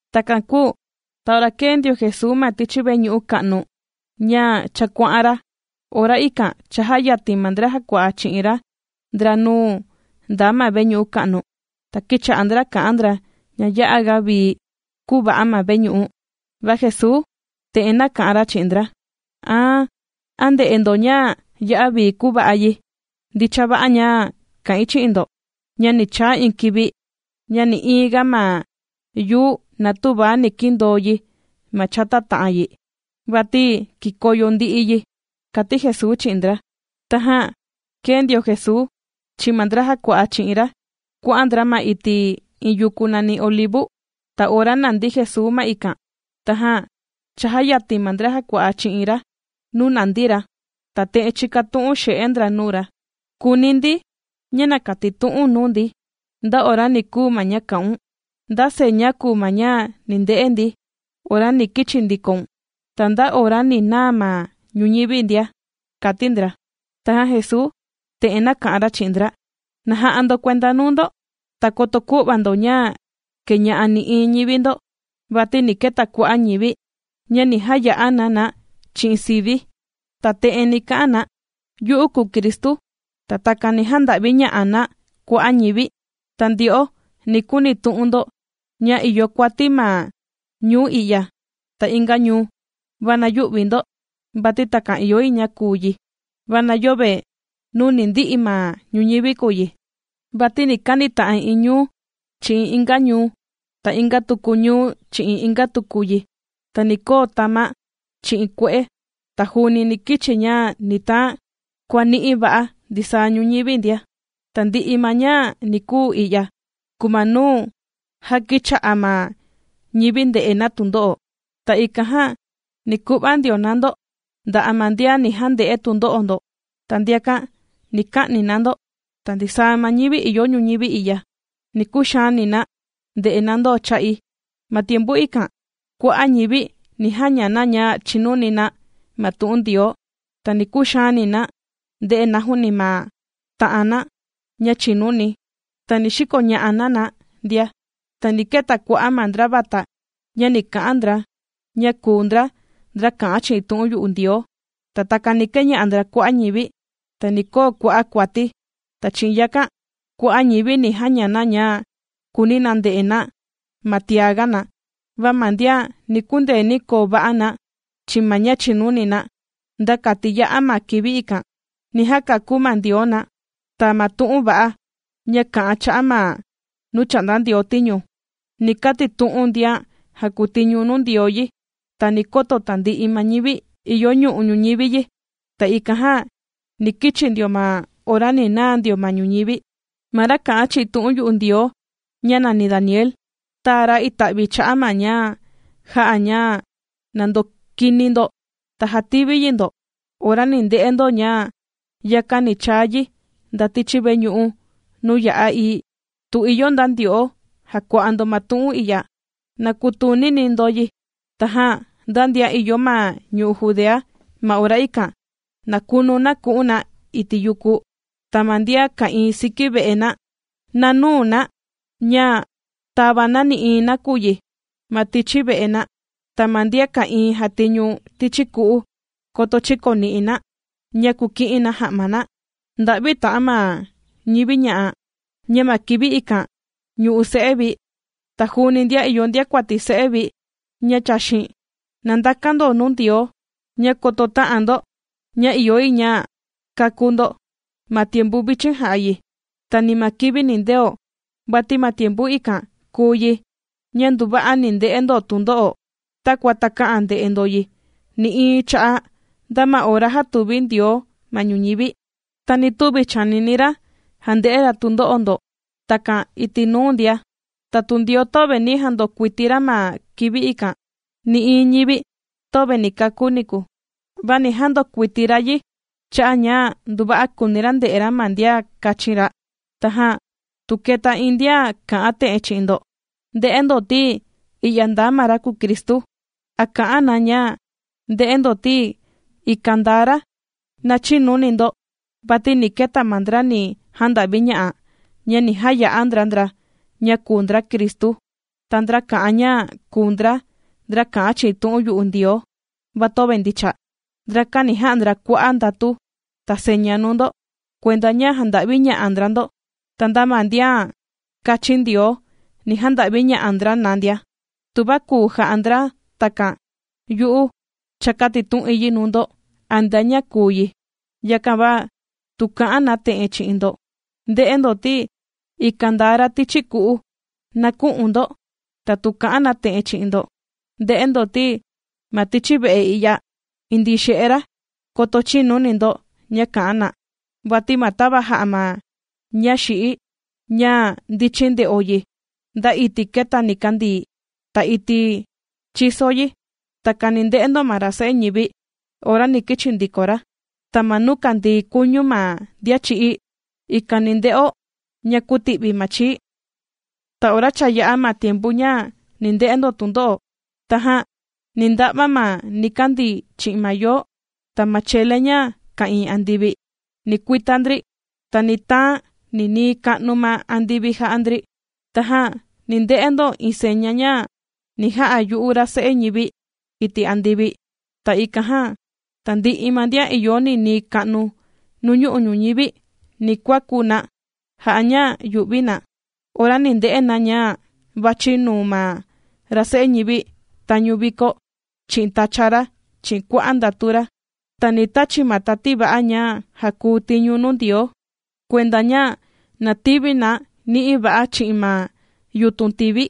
Takan kūu ta ora kēe ndio Jesuu ma tichi veñu'u ka'nu, ña cha kuà'an ra, ora ikan chājayatin ma ndra jàkua'a chi'in ra ndra nuu ndaa ma veñu'u ka'nu, ta kīcha'a ndra kà'an ndra ña ya'a ga vii kūva'a ma veñu'u. Va Jesuu te'en nāka'an ra chi'in ndra: ―Ta, ¿a ndè'e ndo ña ya'a vii kūva'a yi? Ndicha va'a ña kà'in chi'in ndo, ña ni chaa iin kivi, ña nï'iin ga ma yuu na tüva ni kindoo yi ma chata ta'an yi, vati kikoyo ndi'i yi ―kàti Jesuu chi'in ndra. Tajan kēe ndio Jesuu chi'in ma ndra jàkua'a chi'in ra kuà'an ndra ma iti' iin yuku nàni Olivu. Ta ora nàndi Jesuu ma ikan, tajan chājayatin ma ndra jàkua'a chi'in ra nuu nandi ra, ta te'en chīkatu'un xe'e ndra nuu ra: ―Kùuni ndi ña na katitu'u̱n nuu ndi, nda ora ni kuu ma ña kā'un. ¿Nda seña kùu ma ña ni nde'e ndi, ora ni kichi ndikoun, ta nda ora ni naa ma ñuñivi ndia? ―kàti ndra. Tajan Jesuu te'en nāka'an ra chi'in ndra: ―Na ja'a ndo kuenda nuu ndo, ta koto kü'va ndo ña kēña'a nï'iin ñivi ndo. Vati ni keta kua'a' ñivi, ña ni jaya'a na na chi'in sivi̱, ta te'en ni ka'an na: “Yu'u kùu Cristu”, ta takan ni janda'viña'a na kua'a' ñivi. Ta ndyo'o ni kunitu'un ndo, ña ìyo kuati ma ñuu i'ya ta inga ñuu. Va na yü'vi ndo, vati takan ìyo yi ña kuu yi, va na yöve nuu ni ndi'i ma ñuñivi kùu yi. Vati ni kanita'an iin ñuu, chi'in inga ñuu, ta inga tuku ñuu chi'in inga tuku yi, ta ni koo tama', chi'in kue'e, ta juuni ni kichi ña ni taan kuàni'i va'a ndisaa ñuñivi ndia. Tandi'i ma ña ni kuu i'ya, kùu ma nuu já kìcha'a ma ñivi nde'e na tundo'o. ’Ta ikan jan, ni ku'va ndio na ndo nda'a' ma ndian ni jande'e tundo'o ndo, ta ndiakan ni ka'ni na ndo, ta ndisaa ma ñivi ìyo ñuñivi i'ya, ni kuxaani na nde'e na ndo cha'i. Ma tiempu ikan, kua'a' ñivi ni jaña na ña chìnuni na ma tu'un Ndioo, ta ni kuxaani na nde'e na juuni ma ta'an na ña chìnuni, ta ni xikoña'a na na ndia. Ta ni keta kua'a' ma ndra vata, ña ni ka'an ndra, ña kùu ndra, ndra kà'an chi'in tu'un yu'u Ndioo, ta takan ni keña'a ndra kua'a' ñivi. Ta ni koo kua'a' kuati, ta chi'in yakan, kua'a' ñivi ni jaña na ña kùuni na nde'e na ma tiaga na. Va ma ndian ni kundeeni koo va'a na chi'in ma ña chìnuni na nda kati ya'a ma kivi ikan, ni jakakú ma Ndioo na. Ta ma tu'un va'a, ña kà'an cha'a' ma nuu chà'nda Ndioo tiñu, ni katitu'un ndian jàkutiñu nuu Ndioo yi ta ni koto tandi'i ma ñivi ìyo nuñu'u' ñuñivi yi, ta ikan jan ni kichi ndio ma ora ni naa ndio ma ñuñivi. ’Ma ra kā'an chi'in tu'un yu'u Ndioo, ña nàni Daniel, tāa ra ita'vi cha'a' ma ña jà'a ña na ndokini ndo, ta jativi yi ndo. Ora ni nde'e ndo ña yakan ni chaa yi nda tichi veñu'u nuu ya'a ií ―tu ìyo nda ndyo'o jàkua'a ndo ma tu'un i'ya, na kutunini ndo yi. Tajan nda ndian ìyo ma ñu'u' Judea, ma ora ikan, na kunu na ku'un na iti' yuku. Ta ma ndian ka'ìin siki ve'e na, na nüu na ña tàva na nï'iin nakuyi ma tichi ve'e na. Ta ma ndian ka'ìin jàtiñu tichi ku'u, koto chïkokani na, ña kuki'in na ja'ma na. ¡Nda'vi ta'an ma ñivi ña'a, ña ma kivi ikan ñu'u se'e vi, ta juuni ndian ìyo ndiakuati se'e vi ña chàxin! Na ndakan ndo nuu Ndioo, ña koto tä'an ndo ña ìyo yi ña kakú ndo ma tiempu vichin jà'a yi, ta ni ma kivi nindeo. Vati ma tiempu ikan kùu yi, ña nduva'a ni nde'e ndo tundo'o, takua takä'an nde'e ndo yi nï'iin cha'a' nda ma ora jātuvi Ndioo ma ñuñivi, ta ni tüvi chànini ra jande'e ra tundo'o ndo takan iti' nuu ndia. Ta tu Ndioo töve ni jandokuiti ra ma kivi ikan, nï'iin ñivi töve ni kakú niku, va ni jandokuiti ra yi cha'a' ña nduva'a kùuni ra nde'e ra ma ndian kāchin ra. ’Tajan tu kèta iin ndian kà'an te'en chi'in ndo: “Nde'e ndo ti, i'ya ndaa ma ra kùu Cristu”, a kà'an na ña: “Nde'e ndo ti, ikan ndaa ra”, na chïnuni ndo. Vati ni keta ma ndra ni janda'viña'a, ña ni jaya'a ndra ndra ña kùu ndra Cristu, ta ndra kà'an ña kùu ndra, ndra kà'an chi'in tu'un yu'u Ndioo, va töve ndicha. Ndrakan ni ja'a ndra kua'a' ndatu, ta seña nuu ndo, kuenda ña janda'viña'a ndra ndo. Ta nda ma ndian kāchin Ndioo ni janda'viña'a ndra na ndia, tuva kùu ja'a ndra takan. Yu'u cha kātitu'in yi nuu ndo antea ña kùu yi. Yakan va, tu kà'an na te'en chi'in ndo: “Nde'e ndo ti, ikan ndaa ra tichi ku'u”, na kü'un ndo. Ta tu kà'an na te'en chi'in ndo: “Nde'e ndo ti, ma tichi ve'e i'ya indii xe'e ra”, koto chïnuni ndo ña kà'an na. Vati ma tava jà'a ma ña xi'í, ña ndichin nde'o yi nda iti' kèta nikandii, ta iti' chìso yi, takan ni nde'o ma ra Se'e ñivi ora ni kichi ndiko ra. Ta ma nuu kàndii kuñu ma ndian chī'í, ikan ni nde'o ña kùti'vi ma chii. ’Ta ora cha yā'a ma tiempu ña ni nde'e ndo tundo'o. Tajan ni nda'va ma nikandii chi'in ma yoo. Ta ma chele ña ka'ìin andivi, ni kuita ndri, ta ni taan ninii ka'nu ma andivi jà'a ndri. Tajan ni nde'e ndo iin seña ña ni ja'a yu'u ra Se'e ñivi iti' andivi, ta ikan jan, tandi'i ma ndian ìyo ninii ka'nu nuñu'u' ñuñivi ni kuaku na jà'a ña yu'vi na ora ni nde'e na ña vàchi nuu ma ra Se'e ñivi tañu vikó, chi'in tacha ra chi'in kua'a' ndatu ra. Ta ni tachi̱ ma tati va'a ña jàkuu tiñu nuu Ndioo, kuenda ña na tivi na ni'i va'a chi'in ma yutun tivi,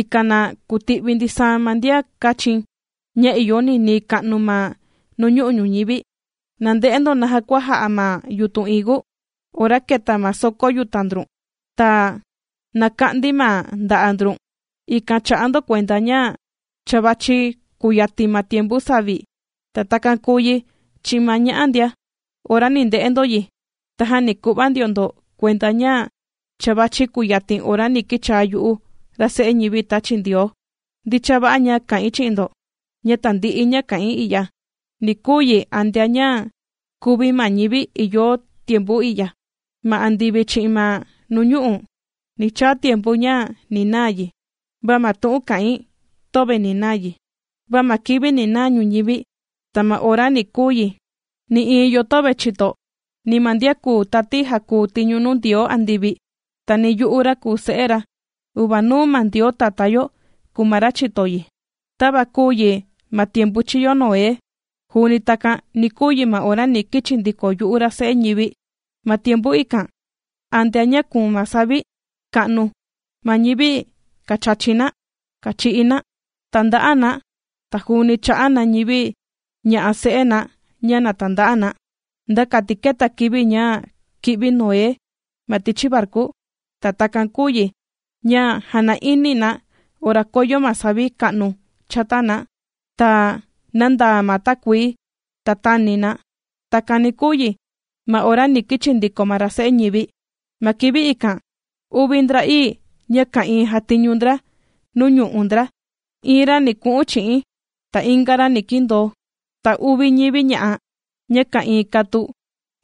ikan na kuti'vi ndisaa ma ndian kāchi̱n, ña ìyo ninii ka'nu ma nuñu'u' ñuñivi. ’Na nde'e ndo naja kua ja'a ma yutun higu: Ora kèta ma soko yuta' ndrun, ta nàka'ndi ma nda'a' ndrun, ikan chà'a ndo kuenda ña cha vàchi kuyatin ma tiempu savi. Ta takan kùu yi chi'in ma ña'a ndia, ora ni nde'e ndo yi, tajan ni ku'va ndio ndo kuenda ña cha vàchi kuyatin ora ni kichaa yu'u, ra Se'e ñivi tāchi Ndioo. Ndicha va'a ña kà'in chi'in ndo, ña tandi'i ña kà'in i'ya, ni kuu yi antea ña kùvi ma ñivi ìyo tiempu i'ya. Ma andivi chi'in ma nuñu'u', ni chaa tiempu ña ni naa yi, va ma tu'un kà'in, töve ni naa yi. ’Va ma kivi ni naa ñuñivi, ta ma ora ni kuu yi, nï'iin yo töve chìto, ni ma ndian kùu tati jàkuu tiñu nuu Ndioo andivi, ta ni yu'u, ra kùu Se'e ra. Uvanuu ma Ndioo Tatá yo kùu ma ra chìto yi. ’Tava kūu yi ma tiempu chīyo Noé, juuni takan ni kuu yi ma ora ni kichi ndiko yu'u ra Se'e ñivi. Ma tiempu ikan, antea ña kuun ma savi ka'nu, ma ñivi kàchachi na, kàchi'i na, tànda'a na, ta juuni chà'a na ñivi ña'a se'e na ña na tanda'a na, nda kati kēta kivi ña kī'vi Noé ma tichi varku. Ta takan kūu yi ña jàna'ini na ora koyo ma savi ka'nu chata na, ta nāndaa ma takuii ta tāni na. Takan ni kuu yi, ma ora ni kichi ndiko ma ra Se'e ñivi. Ma kivi ikan, uvi ndra'ii, ña ka'ìin jàtiñu ndra nuu ñu'u' ndra, iin ra ni ku'un chi'i̱n, ta inga ra ni kindoo. Ta uvi ñivi ña'a, ña ka'ìin katu,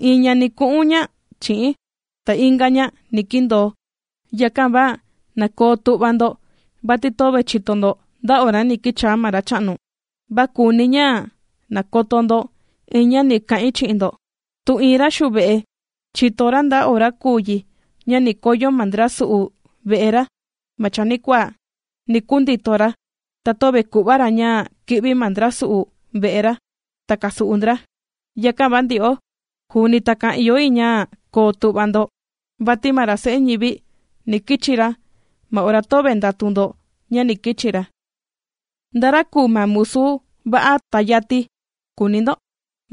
iin ña ni ku'un ña chi'i̱n, ta inga ña ni kindoo. ’Yakan va na koo tu'va ndo, vati töve chìto ndo nda ora ni kichaa ma Racha'nu. Va kùuni̱ ña na koto ndo iin ña ni kà'in chi'in ndo, tu iin ra xuve'e, chìto ra nda ora kùu yi ña ni koyo ma ndra su'u ve'e ra ma chanikuaa, ni kundito ra, ta töve ku'va ra ña kì'vi ma ndra su'u ve'e ra, ta kàsu'u ndra. Yakan va ndyo'o, juuni takan ìyo yi ña koo tu'va ndo, vati ma ra Se'e ñivi, ni kichi ra ma ora töve ndàtu ndo ña ni kichi ra. ’¿Nda ra kùu ma musu va'a ta yati?, kùuni ndo.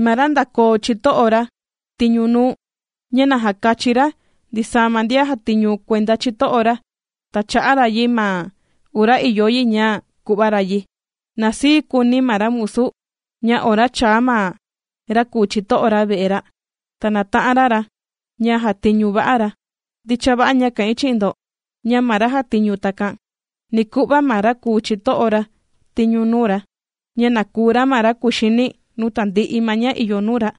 Ma ra ndākoo chito'o ra tiñu nuu, ña na jàkachi ra ndisaa ma ndian jàtiñu kuenda chito'o ra, ta chà'a ra yi ma ora ìyo yi ña ku'va ra yi. Na sii kuuni ma ra musu, ña ora chàa ma ra kùu chito'o ra ve'e ra, ta nàta'an ra ra, ña jàtiñu va'a ra. Ndicha va'a ña kà'in chi'in ndo, ña ma ra jàtiñu takan, ni ku'va ma ra kùu chito'o ra tiñu nuu ra, ña na kùu ra ma ra kuxini nuu tandi'i ma ña ìyo nuu ra.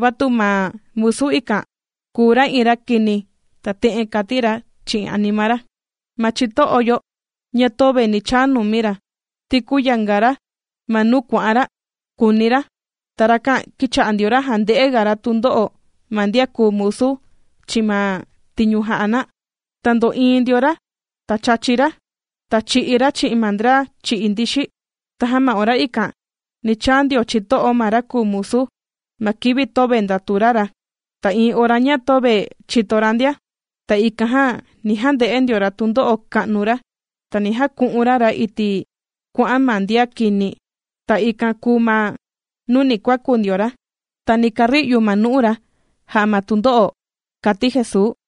Va tu ma musu ikan kùu ra iin ra kini ta te'en kàti ra chi'in anima ra: “Ma chito'o yo na töve ni chaa numi ra, ti kùyanga ra ma nuu kuà'an ra”, kùuni ra. Ta rakan kìcha'a ndio ra jànde'e ga ra tundo'o ma ndian kùu musu chi'in ma tiñu jà'a na, ta ndò'iin ndio ra, chàchi ra, ta chì'i ra chi'in ma ndra chì'i ndixi. Tajan ma ora ikan, ni chaa ndio chito'o ma ra kùu musu, ma kivi töve ndàtu ra ra, ta iin ora ña töve chìto ra ndia. Ta ikan jan, ni jande'e ndio ra tundo'o ka'nu ra, ta ni jaku'un ra ra iti' kuà'an ma ma ndian kini. Ta ikan kùu ma nuu ni kuaku ndio ra, ta ni kari'u ma nu'u ra, jà'a ma tundo'o ―kàti Jesuu.